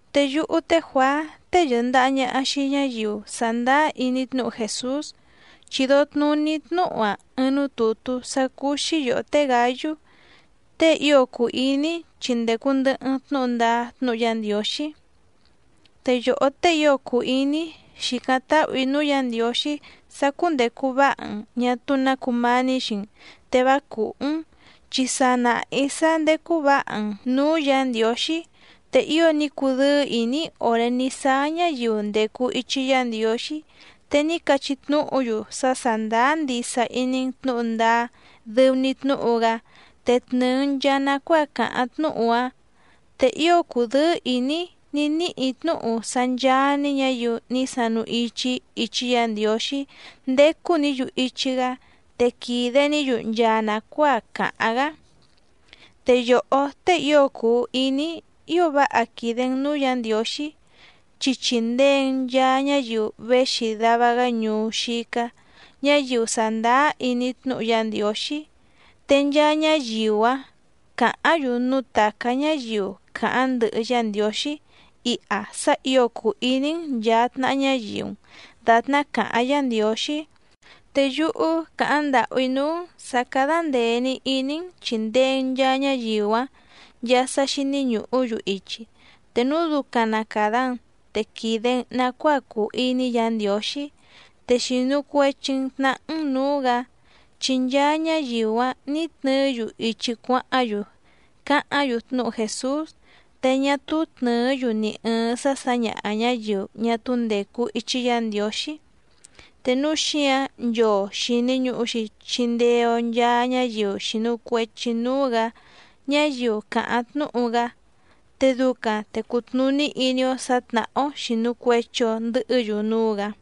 Te yúhú té Juàá tée yɨ̀ndaha ñaha xii ñáyiu sàndáá iní tnúhu Jèsús, chìdo tnuní‑í tnúhu‑a ɨɨⁿ núú tùtú sá cúú‑xí yòhó té Gǎyú tée ío cùu iní‑í, chi ndècu ndɨhɨ‑n tnúhu ndáá tnúhu Yá Ndiǒxí. Te yòhó tée ío cùu iní‑í, xìcáⁿ táhù‑í núú Yǎ Ndiǒxí sá cúndècu váha‑n ñà túú nǎ cumání xii‑n, te vá cùhú‑n, chi sa nàha‑í sá ndécú vǎha‑n nǔú Yǎ Ndiǒxí. Te ío ní cudɨ́ɨ́ ìní‑í òré ní sáá ñáyiu ndècu ichi Yá Ndiǒxí, te ní cachí tnúhu‑yu sá sàndáá ndisa iní‑n tnǔhu ndáá dɨu‑ni tnúhu‑gá te tnɨ̀ɨ‑n nchaa nacuáa càháⁿ tnúhu‑áⁿ. Te ío cùdɨ́ɨ́ ìní‑í ní níhì‑í tnúhu sá ncháá‑ní ñǎyiu ní sanu ichi‑í ichi Yá Ndiǒxí ndécú‑nǐ‑yu ichi‑gá, te quìde‑ní‑yu nchaa nàcuáa càháⁿ‑gá. Te yòhó tée ío cùu iní‑í, ío váha quìde‑n núú Yǎ Ndiǒxí, chi chìndee‑n nchaa ñáyiu véxi dava‑gá ñuú xícá, ñáyiu sàndáá iní tnúhu Yá Ndiǒxí. Te nchaa ñáyiu‑áⁿ càháⁿ‑yu núú tàcá ñáyiu càháⁿ ndɨhɨ Yá Ndiǒxí iha sá ǐo cùu iní‑n nchàa tnaha ñáyiu‑n dàtná càháⁿ Yǎ Ndiǒxí. Te yúhú càháⁿ ndàhú‑í núú‑n sǎ cádá ndèe‑ni iní‑n chìndee‑n nchaa ñáyiu‑áⁿ nchaa sá xíní ñùhú‑yu ichi. Te núu ducaⁿ na càda‑n te quìde‑n nacuáa cùu iní Yǎ Ndiǒxí, te xìnu cuechi‑n tnahá‑n nǔú‑gǎ. Chi nchaa ñáyiu‑áⁿ nǐ tnɨɨ́‑yu ichi cuáháⁿ‑yu càháⁿ‑yu tnúhu Jèsús. Te ñá túú tnɨ̀ɨ́‑yu ni ɨ̀ɨⁿ sá sǎñaha ñǎyiu ñá túú ndècu ichi Yá Ndiǒxí. Te núu xíǎⁿ nchoo xìni ñuhu‑xi chindee‑o nchaa ñáyiu xìnu cuechi núú‑gǎ ñáyiu càháⁿ tnúhu‑gá, te ducaⁿ te cutnùní iní‑ó sǎ tnàhá‑ó xìnu cuechi‑o ndɨhɨ́‑yu núú‑gǎ.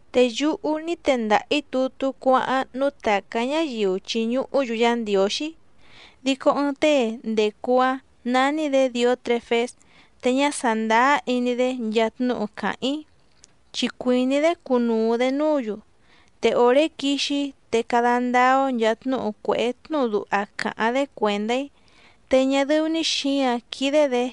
Te yúhú ní tendaha‑ǐ tutú cuáháⁿ núú tàcá ñáyiu chìñuhú‑yu Yá Ndiǒxí, dico ɨɨⁿ tée ndècu‑áⁿ nání‑dě Dìótrefés, te ñá sàndáá iní‑dé nchaa tnúhu càháⁿ‑í, chi cuìní‑dé cunuu‑dě núǔ‑yu. Te òré quixi‑í te cada ndáá‑ó nchàa tnúhu cuèhé tnúhu duha càháⁿ‑dé cuèndá‑í. Te ñá dɨ́ú‑ní xǐǎⁿ quídé‑dě,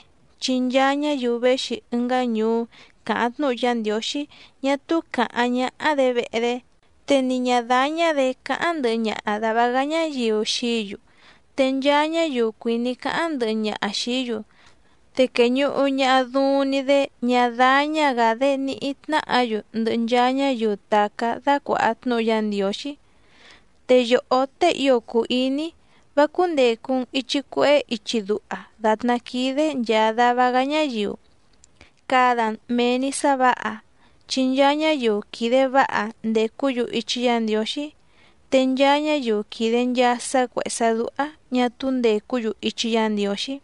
chi nchaa ñáyiu véxi ɨngá ñuú càháⁿ tnúhu Yá Ndiǒxí ñá túú càháⁿ ñáhá‑dě vehe‑dé, te ni ñǎ dáñá‑dě cáháⁿ ndɨhɨ ñaha dàva‑gá ñáyiu xií‑yu. Te nchaa ñáyiu cuìní cáháⁿ ndɨhɨ ñaha xìí‑yu, te quèñuhu ñaha duuⁿ‑ni‑dé ñá dáñá‑gǎ‑dé níhí tnáhǎ‑yu ndɨhɨ nchaa ñáyiu tàcá dácuàha tnúhu Yá Ndiǒxí. Te yòhó tée ío cùu iní‑í, vá cúndècu‑n ichi cuehé ichi duha dàtná quídé nchàa dava‑gá ñáyiu, cada‑n mèe‑ni sá vǎha. Chi nchaa ñáyiu quìde váha ndècú‑yu ichi Yá Ndiǒxí. Te nchaa ñáyiu quìde nchaa sá cuèhé sá dúhá ñà túú ndècú‑yu ichi Yá Ndiǒxí.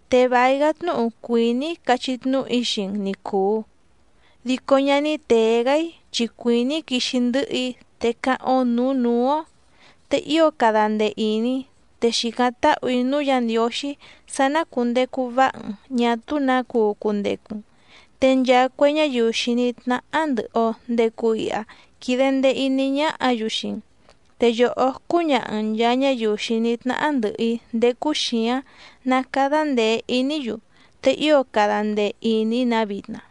Te vài‑gá tnúhu cuìní‑í cachí tnúhu‑í xii‑n ni cùu, dico ñá ní tèe‑gá‑í, chi cuìní‑í quixi ndɨ̌hɨ‑í, te cáháⁿ‑ó nǔú nǔú‑ó. Te ío cada ndee ìní, te xìcáⁿ táhù‑í núú Yǎ Ndiǒxí sá ná cùndecu váha‑n ñà túú nǎ cuu cundecu‑n. Te nchaa cue ñáyiu xìní tnáhá ndɨ̀hɨ‑o ndecu iha quide ndee iní ñáhǎ‑yu xii‑n. Te yòhó cúñaha‑n nchàa ñáyiu xìní tnáhá ndɨ̀hɨ‑í ndécú xǐáⁿ ná càda ndee iní‑yu. Te ío cada ndee ìní‑nǎ vitna.